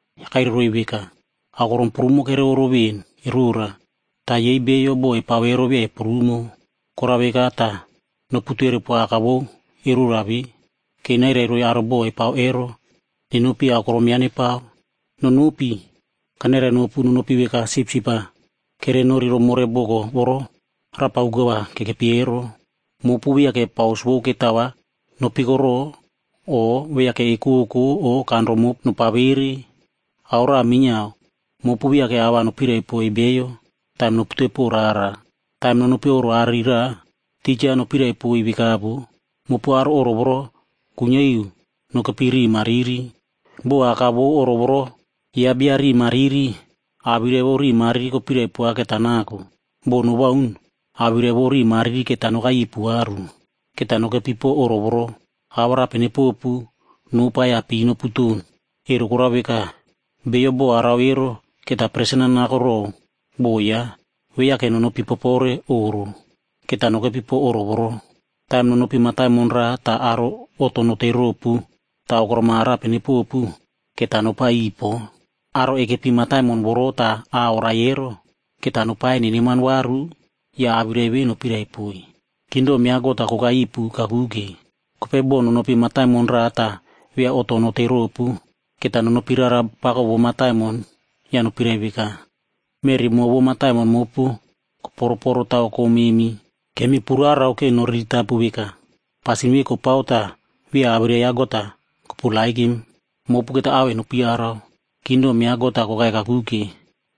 Ya kairai roiy veka, “Aokorom prumo kere oꞌro ven erora. Ta yei beiyo bo epao ero via eprumo. Korao veka ta noputere poa Aka vou erora ve, ke nairai roiy aro bo epao ero nenopi aokorom yaꞌa nepao. Nonopi! Kanairainopu nonopi veka sipsip-aa kerenori romore boko voro rapa uka va kekepi ero. Mopu viake paus vou ketao va nopikoro, o viake ekoko o kanro mopu nopavere. Ao raꞌa minyiao mopu viake a va nopiraipoiy beiyo taim nopute po rara. “Taim nonopi oꞌro aꞌari raꞌa, tija nopiraipoiy veka voꞌo, ‘Mopu aro oꞌro voro kuinyia iu nokepi riꞌi mariri.’ Bo aka vou oꞌro voro yaꞌa bia riꞌi mariri, awirai vou riꞌi mariri kopirai poa keta nako. Bo nowaun, awirai vou riꞌi mariri keta nokai ipu varu. Keta nokepi po oꞌro voro, awarape nepopu, nopa ya pii noputon. Ero korao veka, bio bo arao ero keta presen-a nako row bo yaꞌa. Viake nonopi popore oꞌro, keta nokepi po oꞌro voro. “Taim nonopi mataimon raꞌa ta aro oꞌto notei ropu ta aokorom arape nepopu, keta nopa iꞌiy po. Aro ekepi mataimon voro ta a oraie ero, keta nopaie neneman varu ya awirai ve nopiraipoiy, ‘Kingdom ya God-a kokai ipu kakuke.’ Kopei bo nonopi mataimon raꞌa ta via oꞌto notei ropu, keta nonopi rara pako vou mataimon ya nopirai veka, ‘Meꞌri mo vou mataimon mopu koporoporo taw kom memi. Kemi purarao ke noriritapu veka, pasin ve kopao ta via awirai ya God-a koperepow vai. Mopu keta ao en nopu yarau, kingdom ya God-a kokai kakuke.’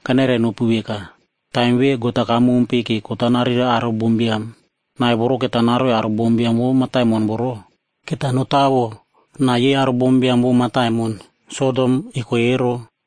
Kanairainopu veka, taim ve God-a kamompe ke kot-a nareirao aro bombiam. Nai voro keta naroiy aro bombiam vou mataimon voro, keta notawo nai yei aro bombiam vou mataimon Sodomb eko ero.”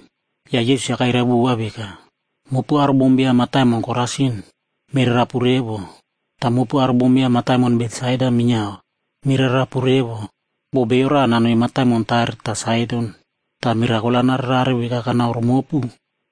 Ya Yesus-a kairai vova veka, “Mopu aro bombiam mataimon Korasin, mirarapu revo! Ta mopu aro bombiam mataimon Betsaida minyiao, mirarapu revo! Bo bio raꞌa nanoi mataimon Tair ta Saidon,c ta mirakol-a nararerare veka kanaoromopu,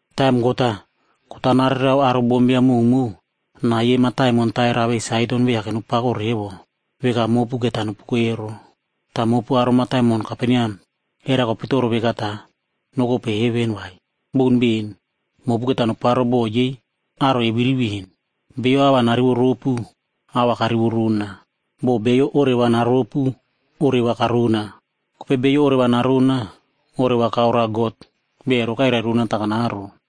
Taim God-a, kot-a nareirao aro bombiam mowmow, nai yei mataimon Tair awei Saidon viake nopako revo, veka mopu keta nopuko ero. Ta mopu aro mataimon Kaperneam, era kopitoro veka ta nokope heven, vai? Boun ben! Mopu keta noparo bo yei aro eviri ven. “Bio awirai-ya narivoropu, a va karivorona. Bo bio oreva naropu, oreva karona. Kopei bio oreva narona, oreva kaoroa God, bia ero kairai rona ta kanaro.”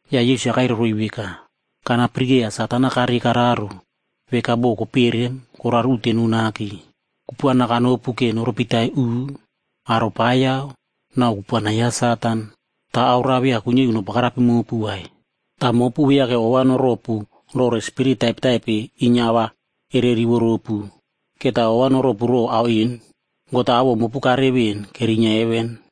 Ya Yesus-a kairai roiy veka, “Kana pirikeiya Satan-a karei kararo veka bo koperem koraro uteno nake. Kupuana kanopu ke noropitai uꞌu, aropaiyao, nau kupuana ya Satan. Ta ao raꞌa via kuinyia iu nobagarapim mopu vai. Ta mopu viake ova noropu rore spirit taipetaipe inyia a va ere rivoropu. Keta ova noropu row ao en, God-a awoꞌo mopu karere ven kerinyia heven.”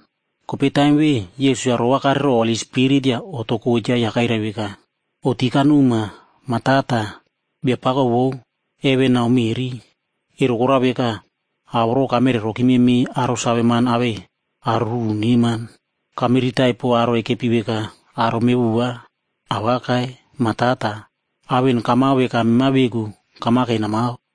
Kopei taim ve Yesus-a ro va kare row Holi Spirit ya oꞌto kocha ya kairai veka, “Oꞌti kanoma, Ma Tata, Biapako vou heven nau meꞌri. Ero korao veka, ao voro kamere rokime mei aro saveman awei aro ruru neman. Kamiritai po aro ekepi veka aro mevova. Awakai! Ma Tata, ao en kamao veka mema veku kamake namao.”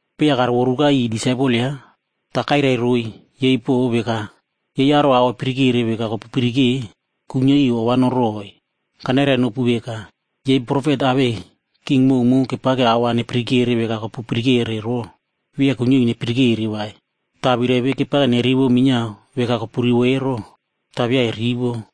Kopei ya karovoruka iꞌiy disaipel yaꞌa, ta kairai roiy yei po veka, “Yei aro ao epirikere veka kopu pirike, kuinyia iu ova noroꞌoi. Kanairainopu veka, yei profet awei king mowmow kepake ao va nepirikere veka kopu pirikere ro, via kuinyia iu nepirikere vai. Ta awirai ve kepake nerivo minyiao veka kopurivo ero, ta via erivo.”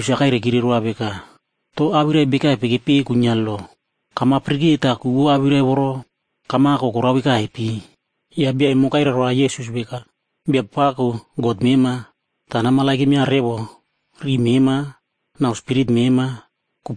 Kopei Yesus-a kairaikire roa veka, “To awirai bekaipe kepeꞌe kuinyia lo? Kamapirike ta ku vou awirai voro kamako korao vekaipe?” Ya bia emo kairai roa Yesus veka, ‘Biapako God mema, ta nameremova revo riꞌi mema, nau spirit mema,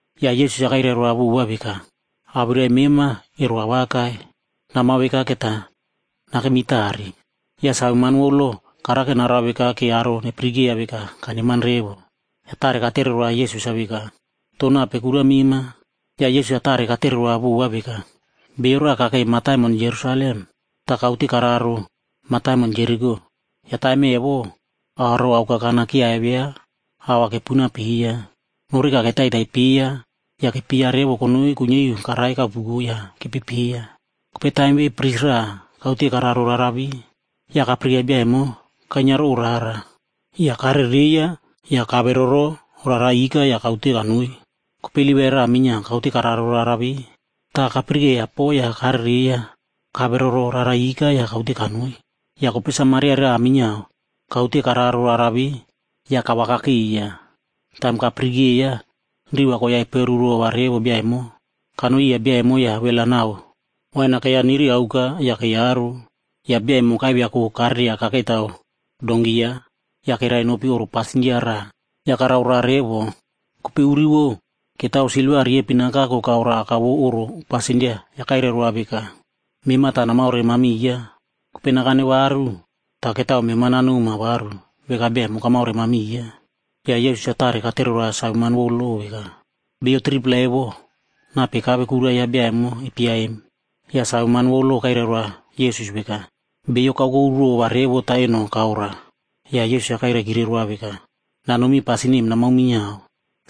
Ya Yesus-a kairai roa vova veka, “Awirai mema ero awakai. Namao veka keta nakemi tare.” Ya saveman vou lo karake narao veka ke aro nepirikeiya veka kaneman revo. Ya tare katere roa Yesus-a veka, “To nape kura mema?” Ya Yesus-a tare katere roa vova veka, “Beiyo raꞌa kakei mataimon Jerusalem ta kaute kararo mataimon Jeriko. Ya taim evo, aro aokakana kyiaivia ao va kepunao peiya. Noreka ketaitai peiya ya kepyeiya revo konoi kuinyia iu karai kaopuko ya kepepeiya. Kopei taim ve pris raꞌa kaute kararo rara ve. Ya kapirikeiya bia emo kainyia row rara, ya karereiya ya kaveroro rara ika ya kaute kanoi. “Kopei Livaig raꞌa minyiao kaute kararo rara ve, ta kapirikeiya po ya karereiya kaveroro rara ika ya kaute kanoi. Ya kopei Samaria raꞌah minyiao kaute kararo rara ve, ya kavakakeiya. Taim kapirikeiya, riꞌi va koiya eperuki rova revo bia emo. Kanoi iya bia emo ya wel-a nau wain-a keiya niri aoka ya keiyaro. Ya bia emo kaiviako kareria kakeitaw donkii yaꞌa, ya kerai nopi oꞌro pasindia raꞌa ya karao roa revo. Kopei uri vou, ketao silva riepin-a kako kaoroa aka vou oꞌro pasindia ya kairai roa veka, ‘Mema ta namaoremamiya. Kopei nakane varu, ta ketao mema nanoma varu veka bia emo kamaoremamiya.’” Ya Yesus-a tare katere roa saveman vou lo veka, “Beiyo 3-pla evo, nape kave kura yaꞌa bia emo epyeiya em?” Ya saveman vou lo kairai roa Yesus veka, “Bio ve kaokokurova revo ta eno kaoroa.” Ya Yesus-a kairaikire roa veka, “Nanomi pasin em namao minyiao.”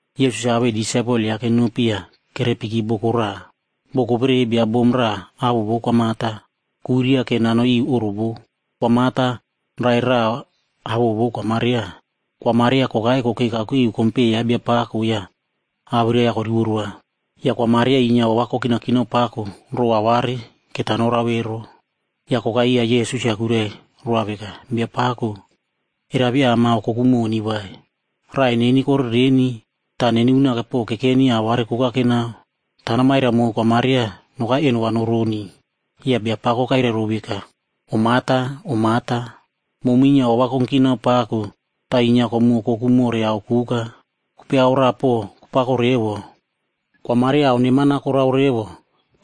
Yesus-a awei disaipel yaꞌa kenopi ya kerepiki boko raꞌa. Boko vere bia bom raꞌa awoꞌo vou Kwa Marta, kuiria ke nanoi iu oꞌro vou. Kwa Marta raꞌai raꞌa awoꞌo vou Kwa Maria. Kwa Maria kokai kokei kakuke iu kompeꞌe ya Biapako ya awirai-ya korivo roa. Ya Kwa Marta inyia ova kokinakinao pako row aware keta norao ero. Ya kokai iya Yesus ya kuirai roa veka, “Biapako, era via amaokokumoni vai? Raꞌai neni korereni, ta neni unake po kekeni aware koka kenao. Ta namairai mow Kwa Maria nokai eno va noroni.” Ya Biapako kairai row veka, “Om Marta, Om Marta, momu inyia ova kongkinao pako ta inyia komuokoku more ao koka. Kopei ao raꞌa po kopako revo, Kwa Maria ao neman-a korao revo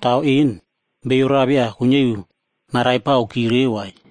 ta ao en, bio raꞌa via kuinyia iu naraipaokireu vai.”